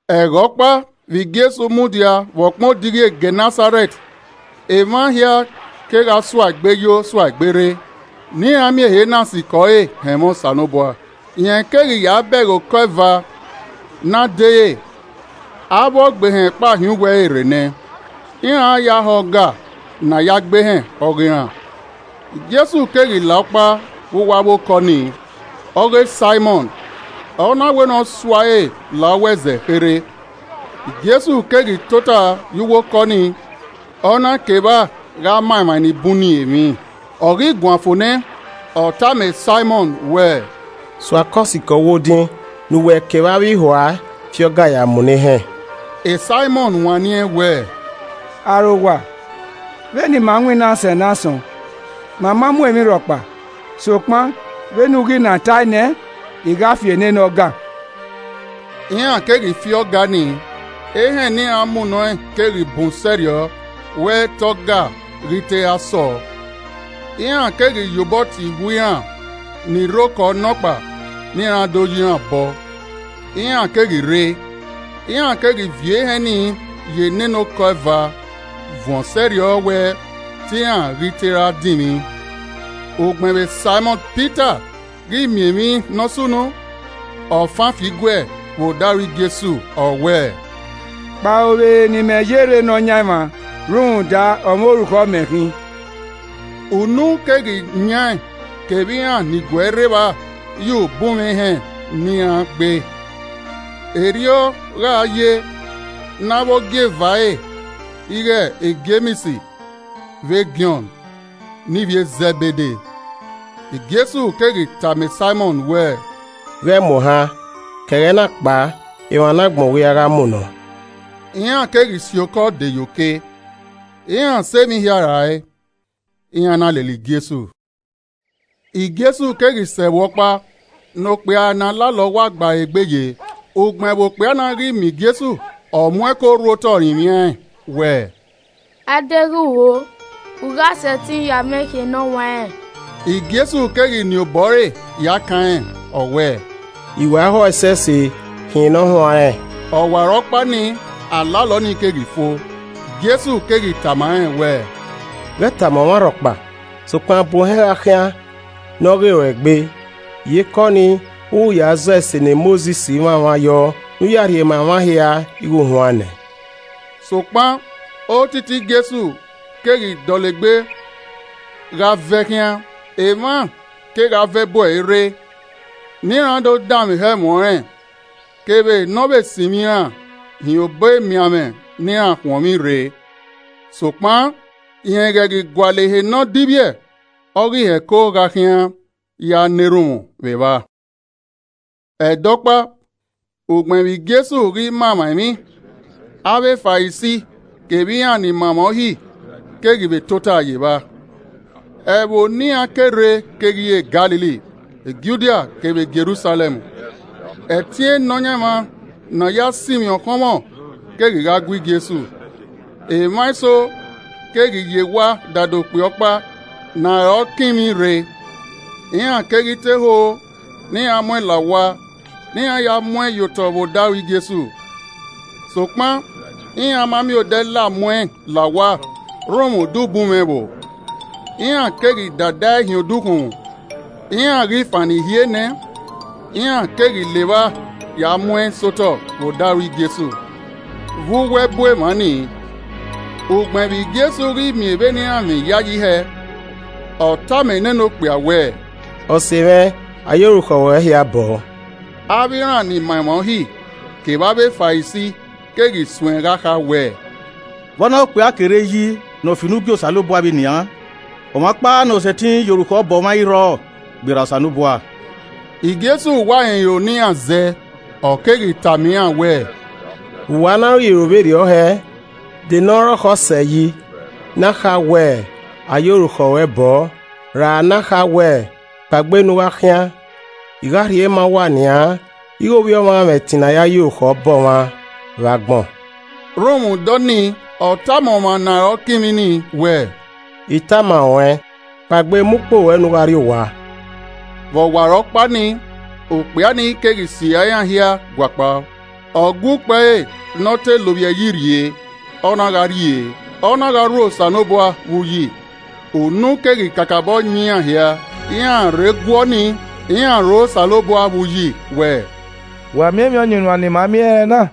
Ẹghẹ ọkpa vbe Jesu mudia vbe ọkpẹn odighi e Gẹnẹsarẹt, emwa hia kegha sua egbe yo sua egbe rre ne iran miẹn ehe na sikẹ ọre họn ẹmwẹ Osanobua. Rẹn keghi ya bẹghe okọ eva ne a dere, avbe ọgbehẹn kpao hin uwu ẹre rre nẹ, iran ra ya họ ọga ne a ya gbe ehẹn ọghe iran. Jesu keghi la ọkpa vbe avbe okọ nii, ọghe Saimọn, ọ na wẹ ne ọ sua ẹre la uwu ẹzẹ kherhe. Jesu keghi tota ye uwu okọ nii ọ na ke evba gha ma emwa ni bun ni emwi. Ọ ghi guan fo nẹ, ọ tama Saimọn wẹẹ, “Sua okọ sikẹ uwu odin ne uwẹ kevbe avbe ihua fi ọga ya munọ ehẹn.” Saimọn wanniẹn wẹẹ, “Arowa, vbe ne ima winna sẹ ne asọn, ma ma mu emwi rhọkpa, sokpan vbene u ghi na tae nẹ, I gha fi nene ọga.” Iran keghi fi ọga ni, ehẹn ne iran munọ ẹn keghi bun sẹrriọ wẹ te ọga ghi te ra sọọ. Iran keghi ye obọ tie ihua iran ni rre okọ nọkpa ne iran do yi iran obọ, iran keghi rre, iran keghi viọ ehẹn ni ye nene okọ eva vuọn sẹrriọ wẹ te iran ghi te ra dinmwi. Ugbẹn vbe Saimọn Pita ghi miẹn emwi ne ọ sunu, ọ fan fi igue vbe odaro Jesu, ọ wẹẹ, “Kpao vbe ehe ne imẹ ye rre Nọyaẹnmwa rhunmwuda ọmwa orukhọ mẹ khin!” Unu keghi yan ẹn kevbe iran ni gu ẹe rre evba ye ubunmwẹ ehẹn ne iran gbe. Erriọ gha ye ne avbe ogieva ẹre ighẹ Jems vbe Jọn ne ivbi e Zẹbede. Jesu keghi tama Saimọn wẹẹ, “Ghẹ mu ohan, ke ẹghẹ na kpao emwa ne agbọn u ghi ra gha munọ.” Iran keghi si okọ de ye oke, iran sẹ emwi hia rae, iran na lele Jesu. Jesu keghi sẹ ẹvbo ọkpa ne okpia ọkpa ne alalọ wa gba ẹre egbe ye, ugbẹn vbe okpia na ghi miẹn Jesu, ọ mu ẹko rhu otọ rinmwian ẹn wẹẹ, “A deghẹ u ho, u gha sẹtin ya mwẹ khian ne ọ huanrẹn.” Jesu keghi nien obọ ẹre ya kan rẹn, ọ wẹẹ, “I wa ho ẹsẹse, khian ne ọ huanrẹn.” Ọwarọkpa nii, alalọ nii keghi fo. Jesu keghi tama rẹn wẹẹ, “Ghẹ tama ọmwa rhọkpa, sokpan, bu ohẹn gha khian ne ọ ghe ruẹ egbe, iyeke ọnii, u ghi ya zọ ese ne Mosis mwamwa yọ ne u ya rhie ma emwa hia ighe u huan nẹ!” Sokpan otiti Jesu keghi dọlegbe gha vẹ khian, emwa kegha vẹ bu ẹre rre ne iran do danmwehọ ẹmwẹ ọnrẹn kevbe ne ọ vbe sinmwi iran hin ohọ emianmwẹ ne iran khuọnmwi rre. Sokpan, rẹn ghẹ ghi gualọ ehe ne ọ divbiẹ, ọ ghi hẹko gha khian ya na erhunmwu vbe evba. Ẹdẹ ọkpa, ugbẹn vbe Jesu ghi ma emwa emwi, avbe Farisi kevbe iran ni ma emwa uhi keghi vbe tota ye evba, ẹvbo ne iran ke rre keghi re Galili, Judia kevbe Jerusalẹm. Ẹtin e Nọyaẹnmwa ne a ya sinmwi ọkhọnmwọ keghi gha gue Jesu. Emwa eso keghi ye ewa dada okpia ọkpa ne aroọ kinmwi rre. Iran keghi te ho ne iran mu ẹn la owa ne iran ya mu ẹn ye otọ vbe odaro Jesu. Sokpan iran ma miẹn odẹ la mu ẹn la owa rhunmwuda ubunmwẹ ẹvbo. Iran keghi dada ẹe hin odukhunmwu, iran ghi fannọ ihie nẹ, iran keghi la evba ya mu ẹn sẹ otọ vbe odaro Jesu vbe uwu ẹbu emwa ni. Ugbẹn vbe Jesu ghi miẹn vbene iran mwẹ iyayi hẹ, ọ tama nene okpia wẹẹ, “Ọse mwẹ, a ye orukhọ ruẹ hia bọọ.” Avbe iran ni ma emwa Uhi kevbe avbe Farisi keghi suẹn gha kha wẹẹ, “Vbe ọna ghe okpia ke rre yi ne ọ fi unu gie Osanobua vbe nian? Ọmwa ọkpa ne ọ sẹtin ye orukhọ bọ ọmwa ẹ i rrọọ gberra Osanobua.” Jesu wa rẹn iro ne iran zẹ, ọ keghi tama iran wẹẹ, “Vbe uwa na ro iro vberriọ heẹẹ? De ne ọ rọkhọ sẹ yi, ne a kha wẹẹ, ‘A ye orukhọ ruẹ bọọ,’ ra ne a kha wẹẹ, ‘Kpaegbe ne u gha khian?’ I gha rhie ma uwa nian ighe Ovbi Ọmwa mwẹ ẹtin ne a ya ye orukhọ bọ ọmwa vbe agbọn.” Rhunmwuda ọnii ọ tama ọmwa ne arọ kinmwi ni wẹẹ, “I tama ruẹn, kpaegbe, mu ukpo ruẹ ne u gha rrie owa!” Vbe ọwarọkpa nii, okpia nii keghi sirra iran hia gua kpao, ọ gua ukpo ẹre ne ọ te lovbiẹ yi rhie, ọ na gha rrie, ọ na gha rho Osanobua vbe uyi. Unu keghi kakabọ yan iran hia. Iran rhe guọ nii, iran rho Osanobua vbe uyi wẹẹ, “Wẹ miẹn emwi ọyunnuan ne ima miẹn ẹrẹna!”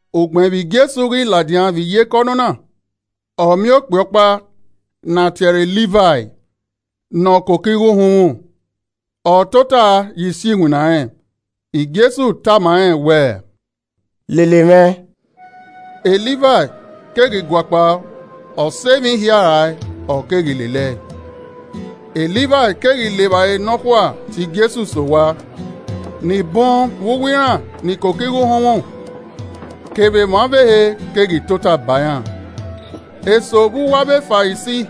Ugbẹn vbe Jesu ghi ladian vbe iyeke ọnọna, ọ miẹn okpia ọkpa ne a tie ẹre Livai ne ọ koko igho uhunmwu, ọ tota ye isi iwinna rẹn. Jesu tama rẹn wẹẹ, “Lele mwẹ.” Livai keghi guakpao, ọ sẹ emwi hia rae, ọ keghi lele ẹe. Livai keghi le evbare nọkhua tie Jesu sẹ owa. Ni bun vbe uwu iran ni koko igho uhunmwu kevbe emwa ọvbehe keghi tota ba iran. Eso vbe uwu avbe Farisi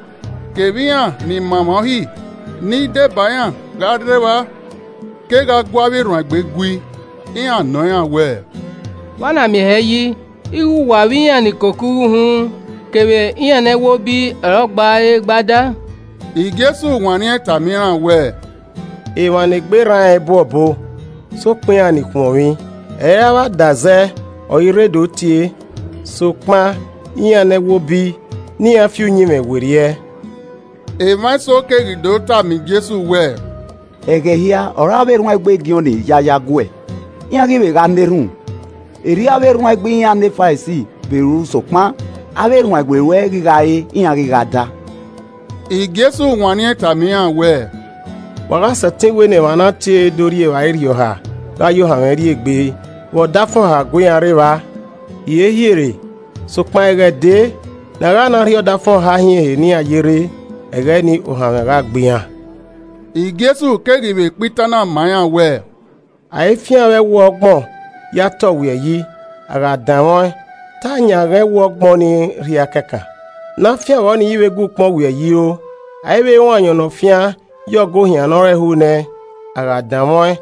kevbe iran ni ma emwa Uhi ni deba iran gha rre evba, kegha gu avbe erhuanegbe gui, iran nọ iran wẹẹ, “Vbe a na miẹn hẹ yi ighẹ uwa vbe iran ni koko igho uhunmwu kevbe iran ne ẹwobi ọre ọ gba re gba da?” Jesu wanniẹn tama iran wẹẹ, “Emwa ne egbe rran rẹn i bu obọ, sokpan iran ni khuọnmwi. Ẹ i re avbe adazẹ ọre I rre to do tie sokpan iran ne ẹwobi ne iran fi uyinmwẹ werriẹ.” Emwa eso keghi do tama Jesu wẹẹ, “Ẹghẹ hia ọre avbe erhuanegbe Jọn ya yo aguẹ, iran ghi vbe gha na erhunmwu, erriọ avbe erhuanegbe iran ne Farisi vbe ru sokpan avbe erhuanegbe ruẹ ghi gha re, iran ghi gha da.” Jesu wanniẹn tama iran wẹẹ, “Wa gha sẹtin wẹ ne emwa ne a tie do rri evbare irhiọha gha ye ohanmwẹ rri egbe vbe ọdafẹn ọha gu iran re evba? Hiehiere! Sokpan ẹghẹ dee ne a gha na rhie ọdafẹn ọha hin ehe ne iran ye rre, ẹghẹ ni ohanmwẹ gha gbe iran.” Jesu keghi vbe kpa itan na ma iran wẹẹ, “A i fian vbe ẹwu ọgbọn ya te ọwiẹyi, a gha danmwẹ ọẹn, te a yanghan ẹwu ọgbọn nii rhia kẹkan, ne afian vbọ nii, ẹ i vbe gua ukpọn ọwiẹyi ro. A i vbe ruẹn ayọn ne ọ fian ye ọgọ ohian nọ rẹnhun nẹ. A gha danmwẹ ọẹn,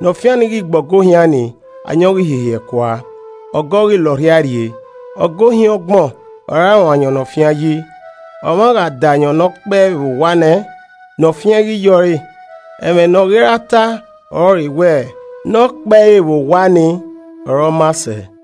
ne ọ fian ni ghi gbe ọgọ ohian nii, ayọn ghi hihiẹ kua, ọgọ ghi la ọrhiae rrie. Ọgọ ohian ọgbọn ọre a ruẹn ayọn ne ọ fian yi. Ọmwa gha da ayọn ne ọ kpẹe vbe owa nẹ, ne ọ fian i ghi yẹ ọre. Ẹmwẹ nọ ghi ra ta ọrọre wẹ, ‘Nọkpẹe vbe owa ni ọre ọ maa sẹ.’”